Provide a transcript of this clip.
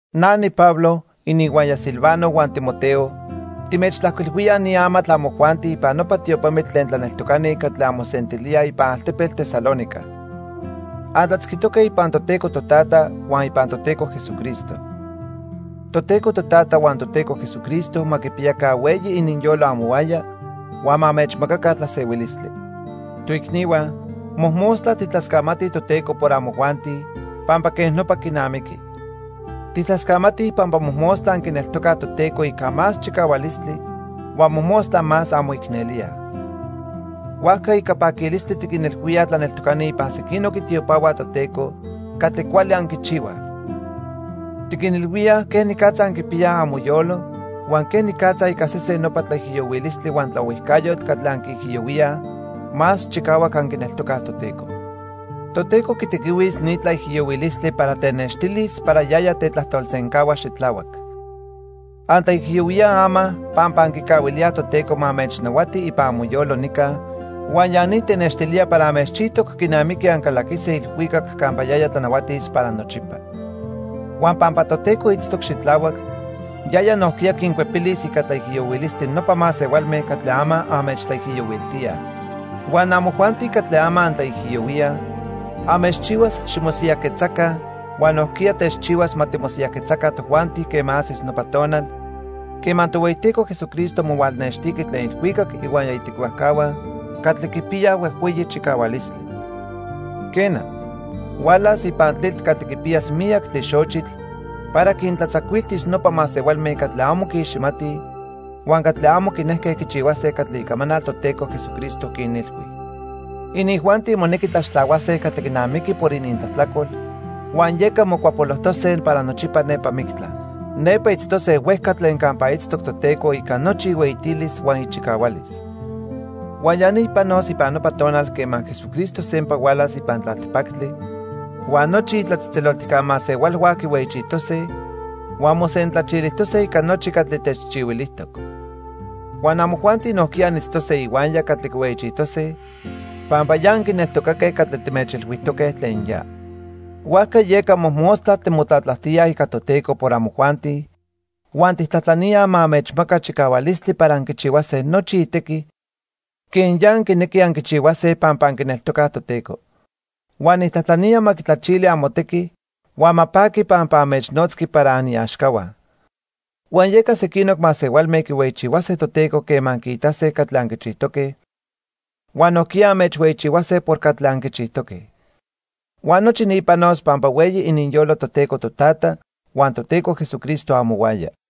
Na niPablo, ininhuaya Silvano huan Timoteo, timechtlajcuilhuilíaj ni amatl amojuanti ipan nopa tiopamitl tlen tlaneltocani catli anmosentilíaj ipan altepetl Tesalónica. Antlatzquitoque ipan Toteco Totata huan ipan Toteco Jesucristo. Toteco Totata huan Toteco Jesucristo ma quipiyaca hueyi ininyolo amohuaya huan ma anmechmacaca tlasehuilistli. Toicnihua, mojmostla tijtlascamatij Toteco por amojuanti, pampa quej nopa quinamiqui. Tijtlascamatij pampa mojmostla anquineltocaj Toteco ica más chicahualistli huan mojmostla más anmoicnelíaj. Huajca, ica paquilistli tiquinilhuíaj tlaneltocani ipan sequinoc itiopahua Toteco catli cuali anquichihuaj. Tiquinilhuíaj quenicatza anquipiyaj amoyolo huan quenicatza ica sesen nopa tlaijiyohuilistli huan tlaohuijcayotl catli anquiijiyohuíaj, más chicahuac anquineltocaj Toteco. Toteco quitequihuis ni tlaijiyohuilistli para tenextilis para yaya tetlajtolsencahua xitlahuac. Antlaijiyohuíaj ama pampa anquicahuilíaj Toteco ma anmechnahuati ipan amoyolo nica huan ya ni tenextilía para anmechchijtoc quinamiqui ancalaquise ilhuicac campa yaya tlanahuatis para nochipa. Huan pampa Toteco itztoc xitlahuac, yaya nojquiya quincuepilis ica tlaijiyohuilistli nopa masehualme catli ama anmechtlaijiyohuiltíaj. Huan amojuanti catli ama antlaijiyohuíaj, anmechchihuas ximosiyajquetzaca huan nojquiya techchihuas ma timosiyajquetzaca tojuanti quema ajsis nopa tonal quema Tohueyiteco Jesucristo mohualnextiqui tlen ilhuicac ihuaya itequihuajcahua catli quipiyaj huejhueyi chicahualistli. Quena, hualas ipan tlitl catli quipiyas miyac tlixochitl para quintlatzacuiltis nopa masehualme catli amo quiiximatij huan catli amo quinejque quichihuase catli icamanal Toteco Jesucristo quinilhui. Inijuanti monequi tlaxtlahuase catli quinamiqui por inintlajtlacol, huan yeca mocuapolojtose para nochipa nepa mictla. Nepa itztose huejca tlen campa itztoc Toteco ica nochi ihueyitilis huan ichicahualis. Huan ya ni panos ipan nopa tonal quema Jesucristo sempa hualas ipan tlaltipactli huan nochi itlatzejtzeloltijca masehualhua quihueyichijtose huan mosentlachilijtose ica nochi catli techchihuilijtoc. Huan amojuanti nojquiya anitztose ihuaya catli quihueyichijtose pampa ya anquineltocaque catli timechilhuijtoque tlen ya. Huajca yeca mojmostla timotlatlajtíaj ica Toteco por amojuanti huan tijtlajtlaníaj ma anmechmaca chicahualistli para anquichihuase nochi itequi quen ya anquinequij anquichihuase pampa anquineltocaj Toteco. Huan nijtlajtlanía ma quitlachili amotequi huan ma paqui pampa anmechnotzqui para aniaxcahua. Huan yeca sequinoc masehualme quihueyichihuase Toteco quema quiitase catli anquichijtoque, huan nojquiya anmechhueyichihuase por catli anquichijtoque. Huan nochi ni panos pampa hueyi ininyolo Toteco Totata huan Toteco Jesucristo amohuaya.